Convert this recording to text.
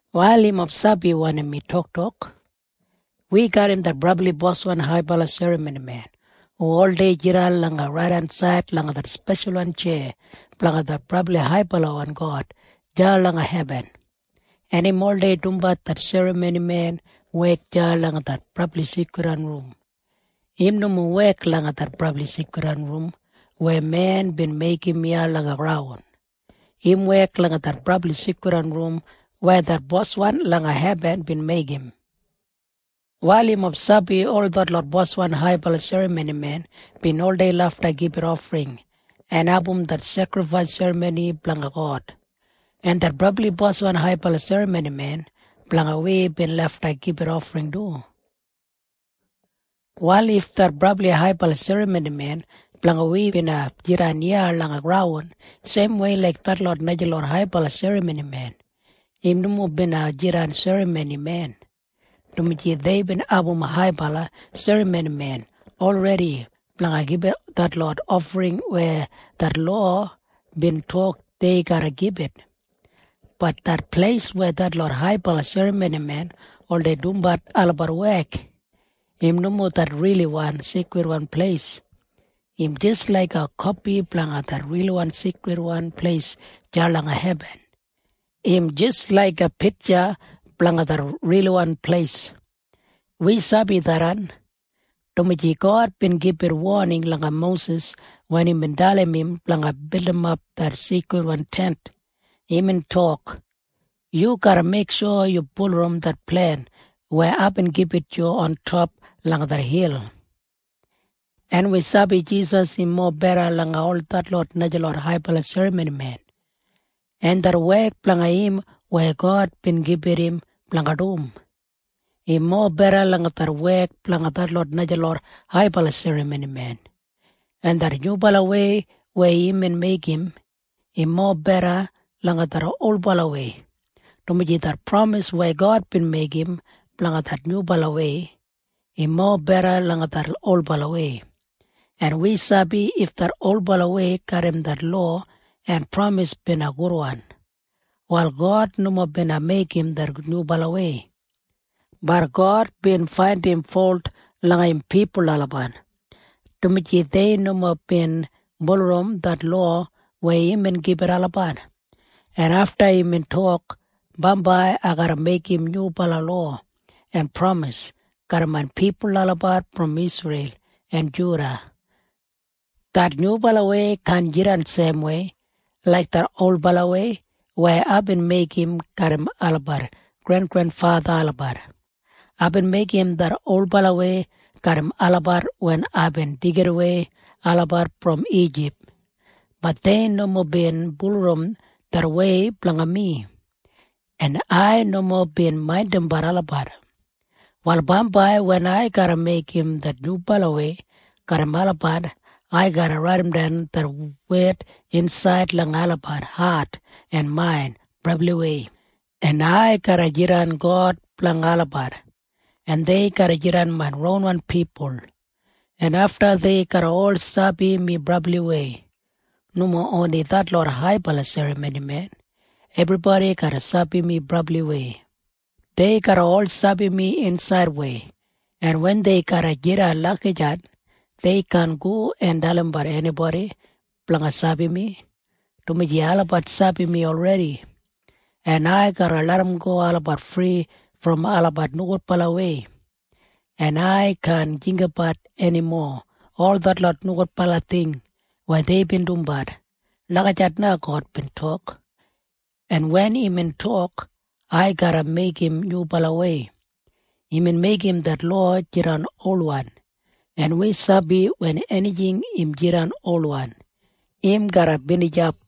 Wal yumob sabi wanim mi toktok? Wi garram det brabli Boswan haibala serramonimen hu oldei jidan langa raidensaid langa det speshalwan tjeya blanga det Brabli Haibalawan God deya langa hebin, en im oldei dumbat det serramonimen wek deya langa det Brabli Seikridwan Rum. Im nomo wek langa det Brabli Seikridwan Rum weya men bin meigim iya langa graun. Im wek langa det Brabli Seikridwan Rum weya det Boswan langa hebin bin meigim. Wal yumob sabi ol detlot boswan haibala serramonimen bin oldei lafta gibit ofring en abum det sekrifais serramoni blanga God, en det brabli Boswan haibala serramonimen blanga wi bin lafta gibit ofring du. Wal if det brabli haibala serramonimen blanga wi bina jidan iya langa graun seimwei laik detlot najalot haibala serramonimen, im nomo bina jidan serramonimen, dumaji deibin abum haibala serramonimen olredi blanga gibit detlot ofring weya det lowa bin tok dei garra gibit. Bat det pleis weya detlot haibala serramonimen oldei dumbat olabat wek, im nomo det riliwan seikridwan pleis. Im jis laiga kopi blanga det riliwan seikridwan pleis deya langa hebin. Im jis laiga pitja blanga det riliwan pleis. Wi sabi tharran, dumaji God bin gibit woning langa Mosis wen imbin dalim im blanga bildimap det Seikridwan Tent. Imbin tok, “Yu garra meiksho yu bulurrum det plen weya aibin gibit yu ontop langa det hil.” En wi sabi Jisas im mobeda langa ol detlot najalot haibala serramonimen, en det wek blanga im weya God bin gibit im blanga dum, im mobeda langa det wek blanga detlot najalot haibala serramonimen, en det nyubalawei weya imbin meigim, im mobeda langa det olbalawei, dumaji det pramis weya God bin meigim blanga det nyubalawei, im mobeda langa det olbalawei. En wi sabi if det olbalawei garram det lowa en pramis bina gudwan, wal God nomo bina meigim det nyubalawei. Bat God bin faindim folt langa im pipul olabat, dumaji dei nomo bin bulurrum det lowa weya imbin gibit olabat, en afta imbin tok, “Bambai ai garra meigim nyubala lowa en pramis garram main pipul olabat brom Isreil en Juda. Det nyubalawei kaan jidan seimwei laik det olbalawei weya aibin meigim garram olabat grengrenfatha olabat. Aibin meigim det olbalawei garram olabat wen aibin deigidawei olabat brom Ijip. Bat dei nomo bin bulurrum det wei blanga mi, en ai nomo bin maindimbat olabat. “Wal bambai wen ai garra meigim det nyubalawei garram olabat, ai garra raidimdan det wed insaid langa olabat hat en main brabliwei, en ai garra jidan God blanga olabat, en dei garra jidan main ronwan pipul, en afta dei garra ol sabi mi brabliwei. Nomo oni detlot haibala serramonimen. Ebribodi garra sabi mi brabliwei. Dei garra ol sabi mi insaidwei, en wen dei garra jidan lagijat, dei kaan go en dalimbat enibodi blanga sabi mi, dumaji olabat sabi mi olredi, en ai garra larramgo olabat fri brom olabat nogudbalawei, en ai kaan jinggabat enimo ol detlot nogudbala ting weya deibin dumbat.” Lagijat na God bin tok. En wen imbin tok, “Ai garra meigim nyubalawei,” imbin meigim det lowa jidan olwan, en wi sabi wen enijing im jidan olwan, im garra binijap.